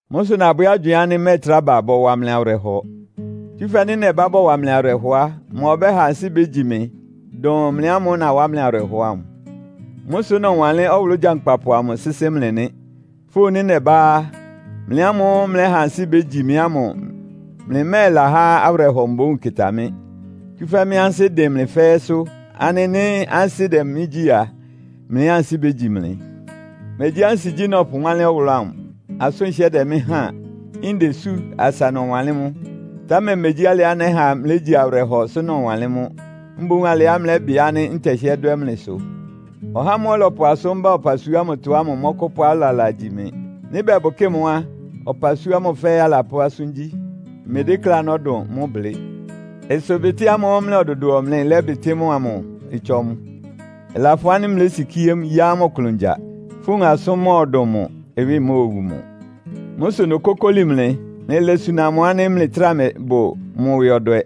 Mʋ́ sʋ nabwɛ́ agywɩɩn ánɩ́ mmɛ́ɛtrá ba bɔwa mlɩ awɩrɛhɔ. Tsúfɛ́ nɩ́ nɛbá bɔwa mlɩ awɩrɛhɔ á, ma ɔbɛ́ha ansɩ́ bégyi mɩ dʋn mlɩ ámʋ́ʋ́ nawá awɩrɛhɔ ámʋ? Mʋ́ sʋ́ nɔwanlɩ́n ɔwʋlʋ́ gyankpapʋ amʋ sɩ́sɩ́ mlɩ nɩ́. Fówun nɩ́ nɛbá á, mlɩ ámʋ́ʋ́ mlɛ́ha ansɩ́ bégyi mɩ ámʋ mlɩmɛ́ɛla há awɩrɛhɔ mboún ɩkɩta mɩ́. Tsúfɛ́ mɩ́ ansɩ́ dɩn mlɩ fɛ́ɛ́sʋ́ ánɩ́ nɩ́ ansɩ́ dɛ mɩ́ gyí a, mlɩ ɛ́ ansɩ́ bégyi mlɩ. Megyí ansigyí nɔpʋwánlɩ́n ɔwʋlʋ́ ámʋ. Asʋ́n ɩhɩ́ɛ́ dɛ mɩ́ háan, ndesú asa nɔwanlɩ́n mʋ́! Támɛ megyí alɩá nɛ́ha mlégyi awɩrɛhɔ sʋ nɔwanlɩ́n mʋ́. Mboún alɩá mlɛ́bɩ ánɩ́ ntɛhɩ́ɛ́ dwɛ́ mlɩ sʋ. Ɔhá ámʋ́ʋ́ ɔlɔpʋ asʋ́n ba ɔpasua ámʋtɔ ámʋ mɔ́kʋ́pʋ́ ɔlala gyi mɩ. Nɩ́ bɛɛ bʋkɩ́ɩ mʋ́ á, ɔpasua ámʋ fɛ́ɛ́ alapʋ́ asʋ́n gyí. (Mmedékléá nɔ́dʋn mʋ́ blɩ́.) Ɩsʋbɩtɩ́ ámʋ́ʋ́ mlɩ ɔdʋdʋɔ mlɩlɛ́bɩtɩ́ mʋ amʋ ɩtsɔ mʋ. Ɩlafʋn ánɩ́ mlésikíé mʋ, yíá mʋ klʋn ngya. Fówun asʋ́n mɔ́ɔdʋn mʋ, ɩwɩ móowu mʋ. Mʋ́ sʋ nokókóli mlɩ, mlɩlɛ suna mʋ ánɩ́ mlɩtráa mlɩbʋ mʋ ɩwɩ ɔdwɛ.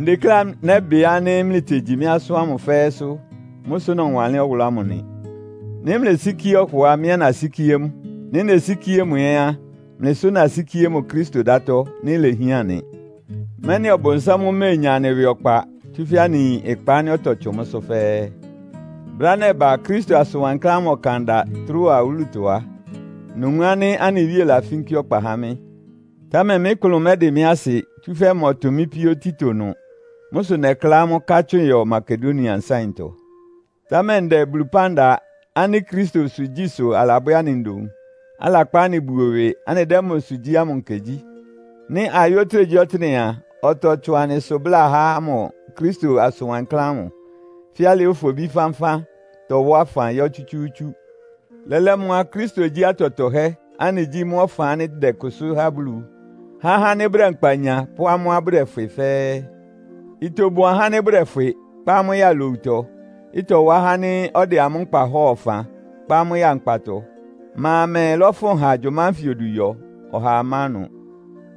Ndekléá nɛ́bɩ nɩ́ mlɩtegyi mɩ́ asʋ́n ámʋ fɛ́ɛ́sʋ́. Mʋ́ sʋ nɔwanlɩ́n ɔwʋlʋ́ ámʋ nɩ. Nɩ́ mlesíkíé ɔkʋ á, mɩ́ ɛ́ nasíkíé mʋ. Nɩ́ nesíkíé mʋ ɛ́ á, mlɩ sʋ́ nasíkíé mʋ Kristo ɩdátɔ́, nɩ́ ilehián nɩ, mɛ́nɩ Ɔbʋnsám oméenya anɩ ɩwɩ ɔkpa, tsúfɛ́ anɩyin ɩkpa ánɩ́ ɔtɔtsʋn mʋ́sʋ́ fɛ́ɛ́. Brɛ́á nɛba Kristo asʋn wankláán ámʋ ɔkan ɔdakpá Troa wúlutɔ á, nowun ánɩ́ anɩ Wíe lafínkí ɔkpa há mɩ́. Támɛ mɩ́ klʋn mɛ́dɩ mɩ́ asɩ, tsúfɛ́ mmɔtʋ mɩ́ píó Tito ɩnʋ. Mʋ́ sʋ nɛklá amʋ́ ká tsʋn yɔ Makedonia nsáɩntɔ. Támɛ ndɛ Bulu ɩpán da ánɩ́ Kristo ɩsʋgyí sʋ alabwɛ́ anɩ ndoun, alakpá anɩ buo ɩwɩ, anɩdɛ́ mʋ ɩsʋgyí amʋ nkɛ gyí. Nɩ́ ayɔ́ ɔtɩ́nɛgyíɔtɩ́nɛ́ a, ɔtɔtsʋn anɩsʋ bláa ahá ámʋ Kristo asʋn wankláán ámʋ, fɛ́ alɩá ofobí fánfán tɔwá ɔfan yɔ́ tsútsúútsú. Lɛ́lɛ́ mʋ́ á, Kristo gyí atɔ tɔhɛ́, anɩgyí mʋ́ ɔfan ánɩ́ ɩdɛkʋsʋ́ há Bulu, há ahá ánɩ́ bʋdɛ nkpa nya pʋ́ amʋ́á bʋdɛfwɩ fɛ́ɛ́. Itobon ahá ánɩ́ bʋdɛfwɩ, kpá amʋ́ ya lowutɔ, ɩtɔwá ahá ánɩ́ ɔdɛ amʋ́ nkpa hɔ́ɔ ɔfan, kpá amʋ́ ya nkpatɔ. Ma mɛɛ lɔ́fʋn ha gyʋma ánfɩ odu yɔ? Ɔhaa má ɩnʋ.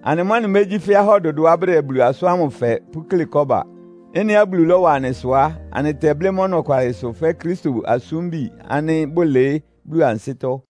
Anɩ mʋ́ anɩmégyí fɛ́ ahá ɔdʋdʋɔá bʋdɛ Bulu asʋ́n ámʋ fɛ pʋ́kle kɔ́ba. Ɩ́nɩá Bulu lɔ́wa anɩ sʋ á, anɩtɛblɩ́ mʋ́ ɔnɔkwalɩsʋ fɛ́ Kristo asúmbi ánɩ́ bʋlɩɩ́ Bulu ansɩ́tɔ́.